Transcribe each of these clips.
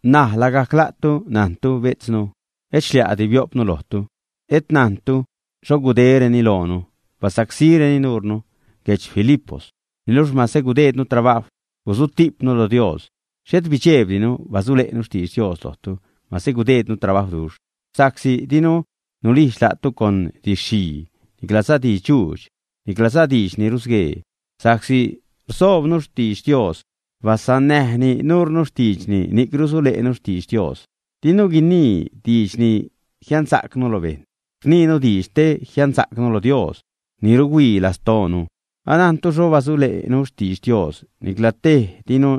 N̲aj lagajc la'tu najntu, bejtznu, et xlia'di bio'pnu lojtu. Et najntu xho gudéreni loonu, basacsíreni nuurnu guedx Filipos. Niluxh mase gudejdnu trabajw, gusutijpnu lo Dios, xhet bidxejbtinu basule'nu xtidx Dios lojtu, mase gudejdnu trabajwduxh. Sa'csi dinu nulijdx la'tu con didx-xhii, niclaza didx-dxuudx, niclaza diidx ni rusguee. Sa'csi rsoobnu xtidx Dios basannäjni nuurnu xtiidxni, ni'c rusule'nu xtidx Dios. Dinu guinii diidx te jiansa'cnu lo bejṉ, rniinu diidx te jiansa'cnu lo Dios ni ruhuii lastoonu. Anajntu xho basule'nu xtidx Dios. Nicla tej dinu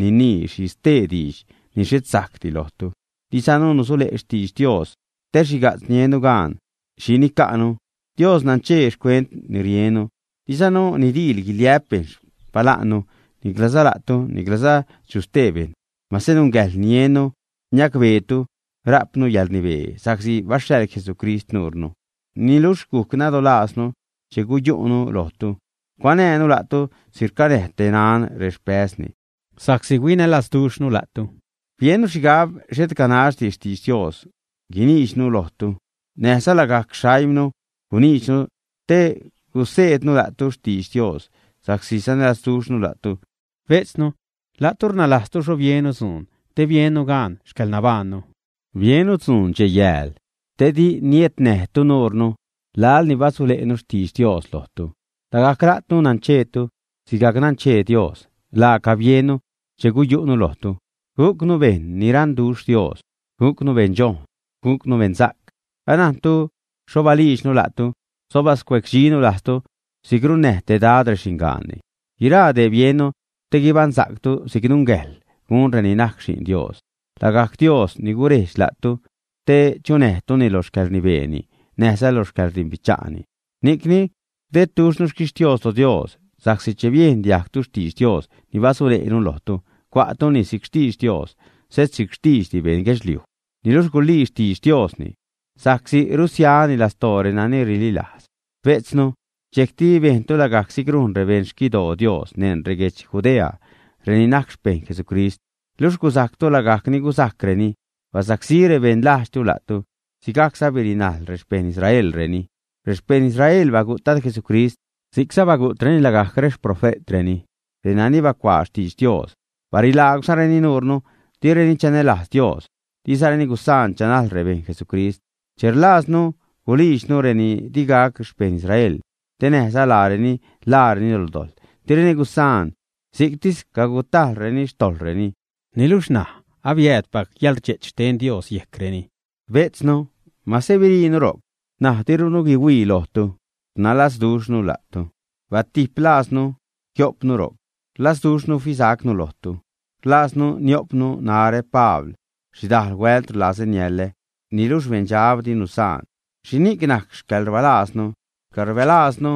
ninii xhi stee diidx ni xhet sajcdi lojtu. Dizanu nusule' xtidx Dios te xhiga'tz niennu gaan xhi nica'nu. Dios nanchee xcuent ni riennu. Dizanu nidiil guiliä'p bejṉ xpala'nnu, niclaza la'tu, niclaza chu stee bejṉ, mase nungäjḻ niennu niacbeetu rajpnu yäḻrnibee sa'csi baxhaḻ Jesucrist nuurnu. Niluxh guc nadolajznu che guyu'nu lojtu, cuanäjnu la'tu si'c rcanäj te naṉ rexpäzni. Sa'csi huinälazduxhnu la'tu, biennu xhigab xhet ganaxdi xtidx Dios guiniidxnu lojtu, näjza lagajc xaimnu guniidxnu te guseednu la'tu xtidx Dios sa'csi sanälazduxhnu la'tu. Bejtznu, la'tu rnalajztu xho biennu dzuun te biennu gaan xcäḻnabaannu. Biennu dzuun dxej-yääl, te di niednäjtu nuurnu laḻ ni basule'nu xtidx Dios lojtu. Lagajc la'tu nancheetu, sigajc nanchee Dios, laaca biennu che guyu'nu lojtu: gujcnu bejṉ ni raṉduxh Dios, gujcnu beṉdxojṉ, gujcnu beṉsa'c. Anajntu xho baliidxnu la'tu, xho bascuecdxinu lajztu si'c runnäj te dad rexingaanni. Guiraa dee biennu, te guibaṉsa'ctu si'c nungäjḻ gun reni najc xi'n Dios, lagajc Dios ni gurejdx la'tu te chunäjtuni lo xcäḻrnibeeni näjza lo xcäḻrdimbicha'ni. Ni'cni rdedduxhnu xquixtios lo Dios sa'csi che biejn diajgtu xtidx Dios ni basule'nu lojtu, cua'tuni si'c xtidx Dios xhet si'c xtiidxdi beṉ guedxliuj. Niluxh gulii xtidx Diosni, sa'csi rusiani lastoo renani rililajz. Bejtznu, dxejcti bejntu lagajc si'c rujn rebejṉ xquidoo Dios neṉ reguedx Judea reni najc xpeṉ Jesucrist; luxh gusajctu lagajc ni gusajcreni, basacsí rebeṉ lajdxtu la'tu. Sigajcza birinajl rexpeṉ Israelreni. Rexpeṉ Israel bagu't Dad Jesucrist, si'cza bagu'treni lagajc rexprofe'treni, renani bacuaa xtidx Dios, barilaagwzareni nuurnu. Direni chanälajz Dios, dizareni gusaan chanajl rebejṉ Jesucrist. Che rlajznu gulijdxnu reni digac rexpeṉ Israel, te näjza laareni ḻaareni lo dojḻ, direni gusaan, si'ctis cagutajḻreni xtojḻreni. Niluxh ṉaj abiäädpac yäḻrdxe'ch xten Dios yejcreni. Bejtznu, mase biriinu ro'c, ṉaj dirunu guihuii lojtu, rnalazduxhnu la'tu, batijp lajznu jio'pnu ro'c, rlazduxhnu fisacnu lojtu. Rlajznu nio'pnu, narä, Pabl xhidal huält rlazä niälä, niluxh beṉdxab di nusaan. ¿Xhini'c najc xcäḻrbääznu, xcäḻrbalajznu,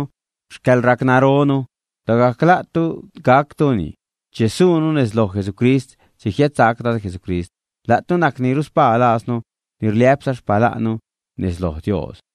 xcäḻracnaronu? Lagajc la'tu gactuni che suunu nez loj Jesucrist che jiädsac Dad Jesucrist. La'tu najc ni ruspaa lajznu ni rliä'pza xpala'nnu nez lo Dios.